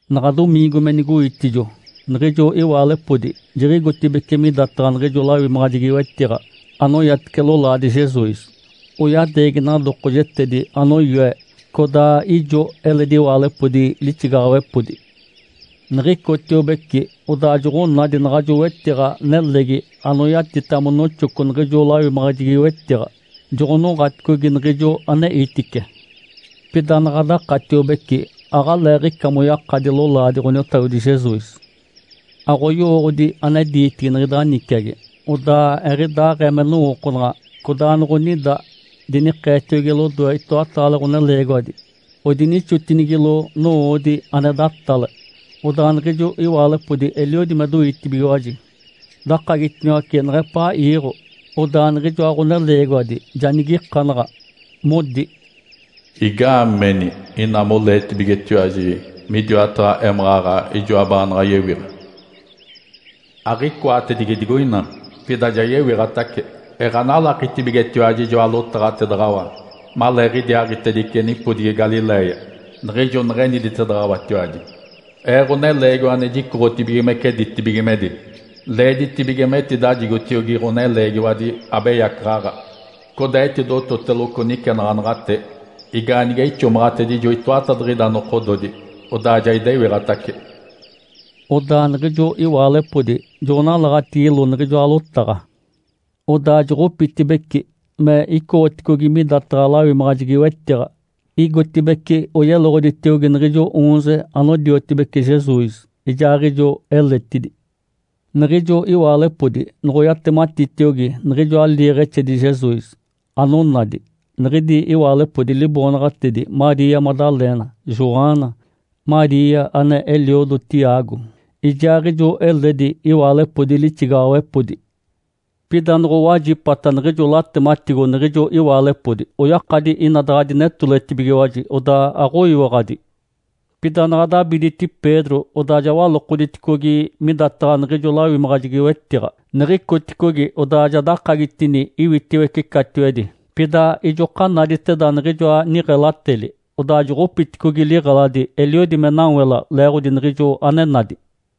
Naɡ̶a domiingo me nigoitijo, niɡ̶ijo iwaalepodi jiɡ̶igotibeci midataɡ̶a niɡ̶ijo lawimaɡ̶ajegi-wetiɡ̶a anoyatice lolaadi Jesus, oyadeegi nadokojetedi anoyoe. Codaa ijo eledi iwaalepodi lixigaɡ̶awepodi. Niɡ̶icotiobeci, odaa joɡ̶onadi naɡ̶ajo wetiɡ̶a nelegi anoyatita monoxoco niɡ̶ijo lawimaɡ̶ajegi-wetiɡ̶a, joɡ̶onoɡ̶aticogi niɡ̶ijo aneitice. Pida naɡ̶a dakatiobece, aɡ̶aleeɡ̶ica moyakadi lolaadi Ǥoniotagodi Jesus. Aɡ̶oyowooɡ̶odi ane diitigi niɡ̶ida niciagi, odaa eɡ̶idaaɡ̶ee me nowookonaɡ̶a, codaa noɡ̶onida dinikeetiogi lodoe itoataale ɡ̶oneleegiwadi, odinixotinigilo nowoodi ane datale. Odaa niɡ̶ijo iwaalepodi eliodi me doitibigiwaji, dakagitiniwace neɡ̶epaa iiɡ̶o. Odaa niɡ̶ijoa ɡ̶oneleegiwadi ja nigikanaɡ̶a, modi, “Igaameni ina moleetibigetiwaji midiwataɡ̶a émaɡ̶aɡ̶a ijoa baanaɡ̶a yewiɡ̶a? Aɡ̶icoatedigi digoina, pida ja yewiɡ̶atace. Eɡ̶analakitibigetiwaji ijoa lotaɡ̶atedaɡ̶awa maleeɡ̶idiaaɡ̶itedice nipodigi Galiléia, niɡ̶ijo neɡ̶eetedaɡ̶awatiwaji, ‘Ee, Ǥoneleegiwa ane jicoɡ̶otibigimece ditibigimedi, leeditibige metidajigotiogi ɡ̶oneleegiwadi abeyacaɡ̶aɡ̶a, codaa etidototeloco nicenaɡ̶anaɡ̶ate, igaanige ixomaɡ̶atedijo itoatadiɡ̶ida nokododi, odaa ja idewiɡ̶atace.’” Odaa niɡ̶ijo iwaalepodi joɡ̶onalaɡ̶atigilo niɡ̶ijoa lotaɡ̶a. Odaa joɡ̶opitibeci, me icoɡ̶oticogi midataɡ̶a lawimaɡ̶ajegi-wetiɡ̶a, igotibeci oyeloɡ̶oditiogi niɡ̶ijo oonze anodiotibece Jesus, ijaaɡ̶ijo eletidi. Niɡ̶ijo iwaalepodi noɡ̶oyatematitiogi niɡ̶ijoa liiɡ̶exedi Jesus, anonadi, niɡ̶idi iwaalepodi liboonaɡ̶atedi Maria Madalena, Joana, Maria ane eliodo Tiago, ijaaɡ̶ijo eledi iwaalepodi lixigaɡ̶awepodi. Pida noɡ̶owajipata niɡ̶ijo latematigo niɡ̶ijo iwaalepodi, oyakadi ina daɡ̶a dinetoletibigiwaji, odaa aɡ̶oyiwaɡ̶adi. Pida naɡ̶a dabiditi Pedro, odaa ja walokoditicogi midataɡ̶a niɡ̶ijo lawimaɡ̶ajegi-wetiɡ̶a. Niɡ̶icoticogi, odaa dakagitini iwitiwece catiwedi. Pida ijoka naditeda niɡ̶ijoa niɡ̶elateli. Odaa joɡ̶opiticogi liɡ̶eladi, eliodi me nawela leeɡ̶odi niɡ̶ijo ane nadi.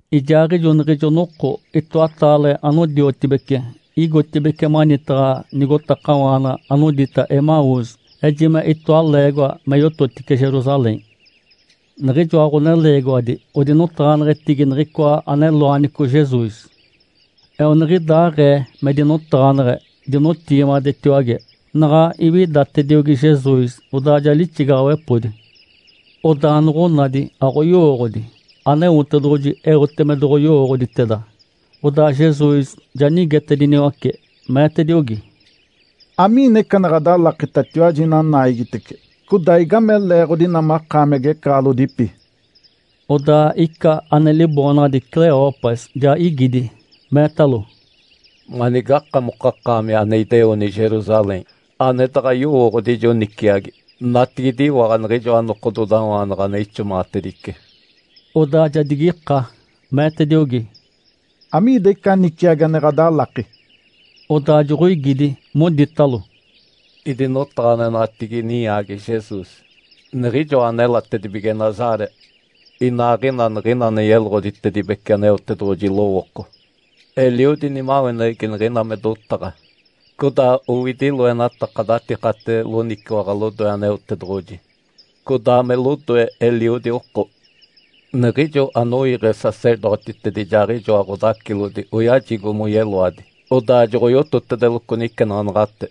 Ijaaɡ̶ijo niɡ̶ijo noko itoataale anodiotibece igotibeci manitaɡ̶a nigotakawaana anodita Emaús, ejime itoa leegoa me yototice Jerusalém. Niɡ̶ijoa ɡ̶oneleegiwadi odinotaɡ̶aneɡ̶etigi niɡ̶icoa ane loanico Jesus. Eoniɡ̶idaaɡ̶ee me dinotaɡ̶aneɡ̶e, dinotigimadetiwage, naɡ̶a iwidatediogi Jesus, odaa ja lixigaɡ̶awepodi. Odaa noɡ̶onadi aɡ̶oyowooɡ̶odi, Aneotedoɡ̶oji eote me doɡ̶oyowooɡ̶oditeda. Odaa Jesus ja nigetediniwace, meetediogi, “Amiina ica ane ɡ̶adalakitatiwaji ina naigitece? Codaa igame leeɡ̶odi ina makaami agecaɡ̶alodipi?” Odaa ica ane liboonaɡ̶adi Cleopas ja igidi, meetalo, “Manigakamokakaami ane ideoni Jerusalém, ane daɡ̶a yowooɡ̶odi ijo niciagi, natigidiwaɡ̶a niɡ̶ijoa nokododawaanaɡ̶a ane ixomaɡ̶atedice?” Odaa ja digika, meetediogi, “Amiida ica niciagi ane ɡ̶adalaki?” Odaa joɡ̶oigidi, moditalo, “Idinotaɡ̶aneɡ̶enaɡ̶atigi ninyaagi Jesus, niɡ̶ijoa anelatedibige Nazaré. Inaaɡ̶ina niɡ̶ina ane yeloɡ̶oditedibece Aneotedoɡ̶oji lowooko, eliodi nimaweneɡ̶egi niɡ̶ina me dotaɡ̶a, codaa owidi loenataka datikate loniciwaɡ̶a lodoe Aneotedoɡ̶oji, codaa me lodoe eliodi oko. Niɡ̶ijo anoiiɡ̶e sacerdotitedi ijaaɡ̶ijoa ɡ̶odacilodi oyajigo moyeloadi, odaa joɡ̶oyototedeloco nicenaɡ̶anaɡ̶ate.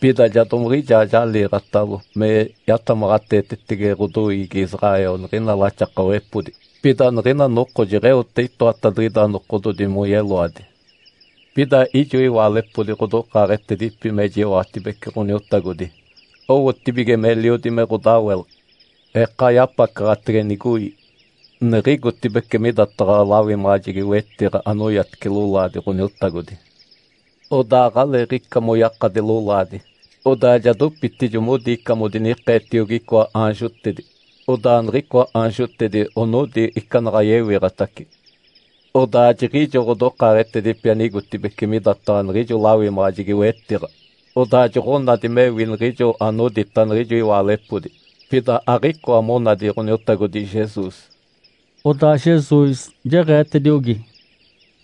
Pida ja domiɡ̶ijaa jaliiɡ̶atalo me yatamaɡ̶ateetetege ɡ̶odoiigi Israel niɡ̶ina laxakawepodi. Pida niɡ̶ina noko jeɡ̶eote itoatadiɡ̶ida nokododi moyeloadi. Pida ijo iwaalepodi ɡ̶odokaaɡ̶etedipi mejiwaɡ̶atibece Ǥoniotagodi, owotibige meliodi me ɡ̶odawela. Eka yapacaɡ̶atege nigoi, niɡ̶igotibeci midataɡ̶a lawimaɡ̶ajegi-wetiɡ̶a anoyatice lolaadi Ǥoniotagodi. Odaa aɡ̶aleeɡ̶ica moyakadi lolaadi. Odaa ja dopitijo modi ica modinikeetiogi icoa aanjotedi, odaa niɡ̶icoa aanjotedi onodi ica naɡ̶a yewiɡ̶atace. Odaa jiɡ̶ijo ɡ̶odokaaɡ̶etedipi anigotibeci midataɡ̶a niɡ̶ijo lawimaɡ̶ajegi-wetiɡ̶a, odaa joɡ̶onadi mewi niɡ̶ijo anodita niɡ̶ijo iwaalepodi. Pida aɡ̶icoa monadi Ǥoniotagodi Jesus.” Odaa Jesus jeɡ̶eetediogi,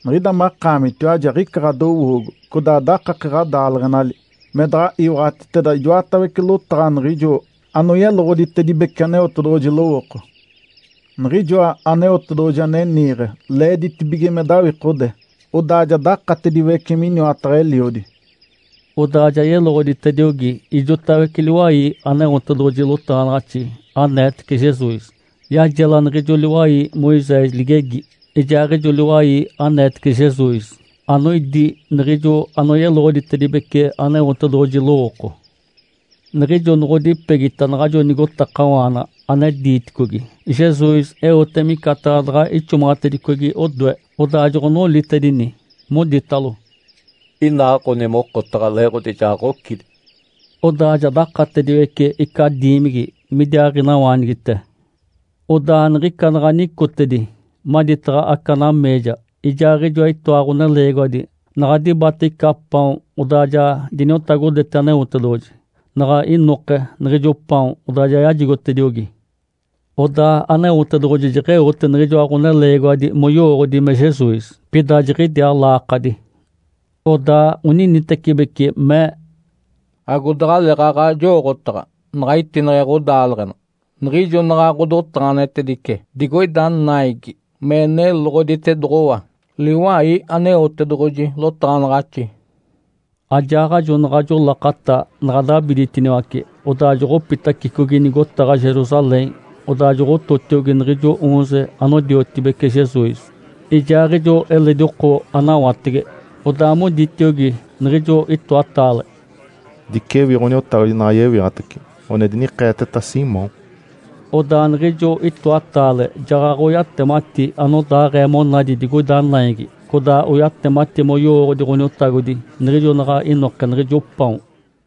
“Niɡ̶ida makaamitiwaji aɡ̶ica ɡ̶adowoogo, codaa dakake ɡ̶adaaleɡ̶enali, me daɡ̶a iwaɡ̶atiteda ijoatawece lotaɡ̶a niɡ̶ijo anoyeloɡ̶oditedibece Aneotedoɡ̶oji lowooko. Niɡ̶ijoa Aneotedoɡ̶oji ane niiɡ̶e leeditibige me dawikode, odaa ja dakatediwece miniwataɡ̶a Eliodi.” Odaa ja yeloɡ̶oditediogi ijotawece liwai Aneotedoɡ̶oji lotaɡ̶anaɡ̶axi aneetece Jesus. Yajela niɡ̶ijo liwai Moisés ligegi, ijaaɡ̶ijo liwai aneetece Jesus, anoidi niɡ̶ijo anoyeloɡ̶oditedibece Aneotedoɡ̶oji lowooko. Niɡ̶ijo noɡ̶odipegita naɡ̶ajo nigotakawaana ane diiticogi, Jesus eote micataɡ̶a daɡ̶a ixomaɡ̶atedicogi odoe. Odaa joɡ̶onolitedini, moditalo, “Inaaɡ̶oni mokotaɡ̶a, leeɡ̶odi ja ɡ̶ocidi.” Odaa ja dakatediwece ica diimigi, midiaaɡ̶inawaanigite. Odaa niɡ̶ica naɡ̶a nicotedi maditaɡ̶a aca nameeja, ijaaɡ̶ijoa itoa ɡ̶oneleegiwadi, naɡ̶a dibate ica paon, odaa ja diniotagodete Aneotedoɡ̶oji. Naɡ̶a inoke niɡ̶ijo paon, odaa ja yajigotediogi. Odaa Aneotedoɡ̶oji jeɡ̶eote niɡ̶ijoa ɡ̶oneleegiwadi moyowooɡ̶odi me Jesus. Pida jiɡ̶idiaa laakadi. Odaa oninitecibeci mee, “Agodaɡ̶aleeɡ̶aɡ̶a, jowooɡ̶otaɡ̶a naɡ̶a itineɡ̶e ɡ̶odaaleɡ̶ena, niɡ̶ijo naɡ̶a ɡ̶odotaɡ̶aneɡ̶etedice digoida naigi me neloɡ̶oditedoɡ̶owa liwai Aneotedoɡ̶oji lotaɡ̶anaɡ̶axi?” Ajaaɡ̶ajo naɡ̶ajo lakata naɡ̶a dabiditiniwace, odaa joɡ̶opitacicogi nigotaɡ̶a Jerusalém. Odaa joɡ̶ototiogi niɡ̶ijo oonze anodiotibece Jesus, ijaaɡ̶ijo eledi oko anawatege. Odaa moditiogi niɡ̶ijo itoataale, “Dicewi Ǥoniotagodi naɡ̶a yewiɡ̶atace. One dinikeeteta Simão.” Odaa niɡ̶ijo itoataale jaɡ̶aɡ̶oyatemati anodaaɡ̶ee monadi digoida naigi, codaa oyatemati moyowooɡ̶odi Ǥoniotagodi niɡ̶ijo naɡ̶a inoke niɡ̶ijo paon.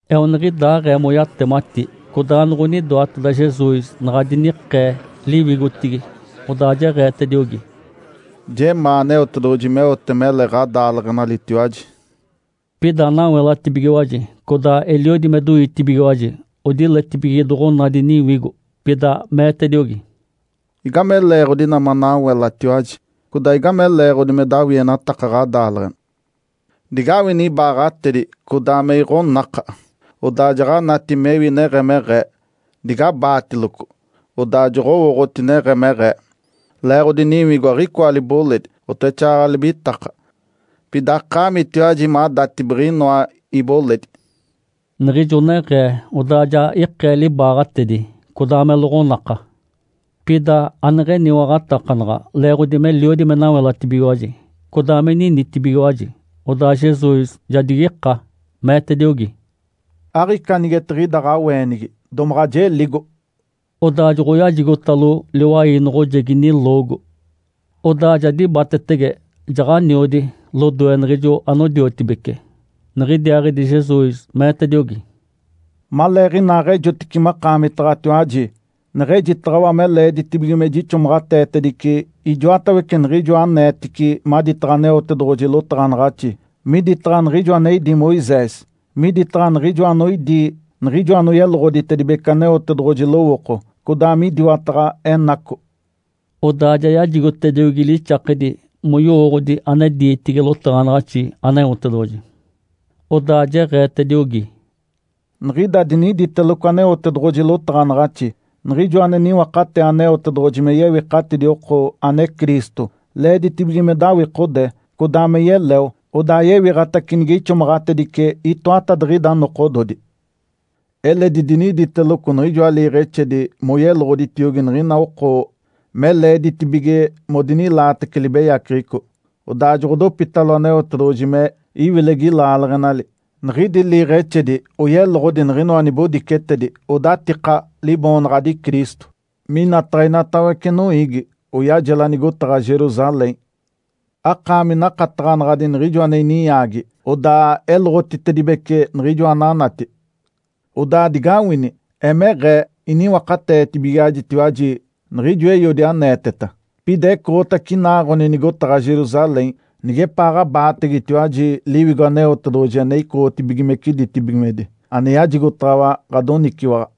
Eoniɡ̶idaaɡ̶ee moyatemati, codaa noɡ̶onidoateda Jesus naɡ̶a dinikee liwigotigi. Odaa jeɡ̶eetediogi, “Jemaa Aneotedoɡ̶oji meote mele ɡ̶adaaleɡ̶enalitiwaji!” Pida nawelatibigiwaji, codaa eliodi me doitibigiwaji, odiletibige doɡ̶onadi niwigo. Pida meetediogi, “Igame leeɡ̶odi ina manawelatiwaji? Codaa igame leeɡ̶odi me dawienataka ɡ̶adaaleɡ̶ena? Digawini ibaaɡ̶atedi, codaa me iɡ̶onaka! Odaa jaɡ̶anati mewi neɡ̶emeɡ̶ee. Digabaatiloco, odaa joɡ̶owooɡ̶oti neɡ̶emeɡ̶ee! Leeɡ̶odi niwigo aɡ̶icoa liboledi, oteɡ̶exaaɡ̶aɡ̶a libitaka, pida akaamitiwaji madati biɡ̶inoa iboledi.” Niɡ̶ijo neɡ̶ee, odaa ja ikee libaaɡ̶atedi, codaa me loɡ̶onaka. Pida aneɡ̶eniwaɡ̶atakanaɡ̶a, leeɡ̶odi meliodi me nawelatibigiwaji, codaa me ninitibigiwaji. Odaa Jesus ja digika, meetediogi, “Aɡ̶ica anigetiɡ̶ida ɡ̶aweenigi domaɡ̶a jeligo?” Odaa joɡ̶oyajigotalo liwai noɡ̶ojegi niloogo. Odaa ja dibatetege, jaɡ̶aniodi lodoe niɡ̶ijo anodiotibece. Niɡ̶idiaaɡ̶idi Jesus meetediogi, “Maleeɡ̶inaaɡ̶ejotice makaamitaɡ̶atiwaji neɡ̶ejitaɡ̶awa me leeditibige me jixomaɡ̶ateetedice ijoatawece niɡ̶ijoa aneetici maditaɡ̶a Aneotedoɡ̶oji lotaɡ̶anaɡ̶axi, miditaɡ̶a niɡ̶ijo ane idí Moisés, miditaɡ̶a niɡ̶ijoa anoidi niɡ̶ijo anoyeloɡ̶oditedibece Aneotedoɡ̶oji lowooko, codaa midiwataɡ̶a enaco.” Odaa ja yajigotediogi lixakedi moyowooɡ̶odi ane diitigi lotaɡ̶anaɡ̶axi Aneotedoɡ̶oji. Odaa jeɡ̶eetediogi, “Niɡ̶ida diniditeloco Aneotedoɡ̶oji lotaɡ̶anaɡ̶axi, Niɡ̶ijoa ane niwakatee Aneotedoɡ̶oji me yewikatidi oko, ane Cristo, leeditibige me dawikode, codaa me yeleo, odaa yewiɡ̶atace nige ixomaɡ̶atedice itoatadiɡ̶ida nokododi. Eledi diniditeloco niɡ̶ijoa liiɡ̶exedi moyeloɡ̶oditiogi niɡ̶ina oko me leeditibige modinilaatece libeyaceɡ̶eco, odaa joɡ̶odopitalo Aneotedoɡ̶oji me iwilegi laaleɡ̶enali. Niɡ̶idi liiɡ̶exedi oyeloɡ̶odi niɡ̶inoa nibodicetedi odatika liboonaɡ̶adi Cristo, minataɡ̶a inatawece noiigi, oyajela nigotaɡ̶a Jerusalém. Akaami nakataɡ̶anadi niɡ̶ijo ane ininyaagi, odaa eloɡ̶otitedibece niɡ̶ijoa ananati! Odaa digawini! Emeɡ̶ee iniwakateetibigaɡ̶ajitiwaji niɡ̶ijo Eiodi aneeteta. Pida ecoɡ̶otace inaaɡ̶oni nigotaɡ̶a Jerusalém, nigepaaɡ̶abaategetiwaji Liwigo Aneotedoɡ̶oji ane icoɡ̶otibigimece ditibigimedi ane yajigotaɡ̶awa ɡ̶adoniciwaɡ̶a.”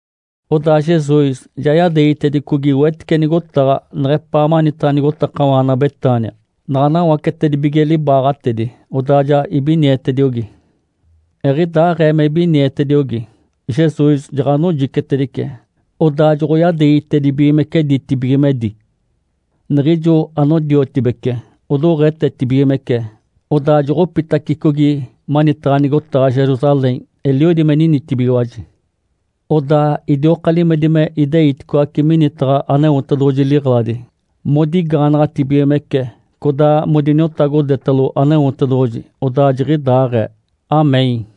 Odaa Jesus ja yadeegitedicogi wetice nigotaɡ̶a neɡ̶epaa manitaɡ̶a nigotakawaana Betânia. Naɡ̶a nawacetedibige libaaɡ̶atedi, odaa ja ibinietediogi. Eɡ̶idaaɡ̶ee me ibinietediogi, Jesus jaɡ̶anojicetedice, odaa joɡ̶oyadeegitedibigimece ditibigimedi. Niɡ̶ijo anodiotibece odoɡ̶etetibigimece, odaa joɡ̶opitacicogi manitaɡ̶a nigotaɡ̶a Jerusalém, eliodi me ninitibigiwaji. Odaa idioka limedi me ideiticoace minitaɡ̶a Aneotedoɡ̶oji liɡ̶eladi, modigaanaɡ̶atibigimece, codaa modiniotagodetalo Aneotedoɡ̶oji. Odaa jiɡ̶idaaɡ̶ee. (Amém).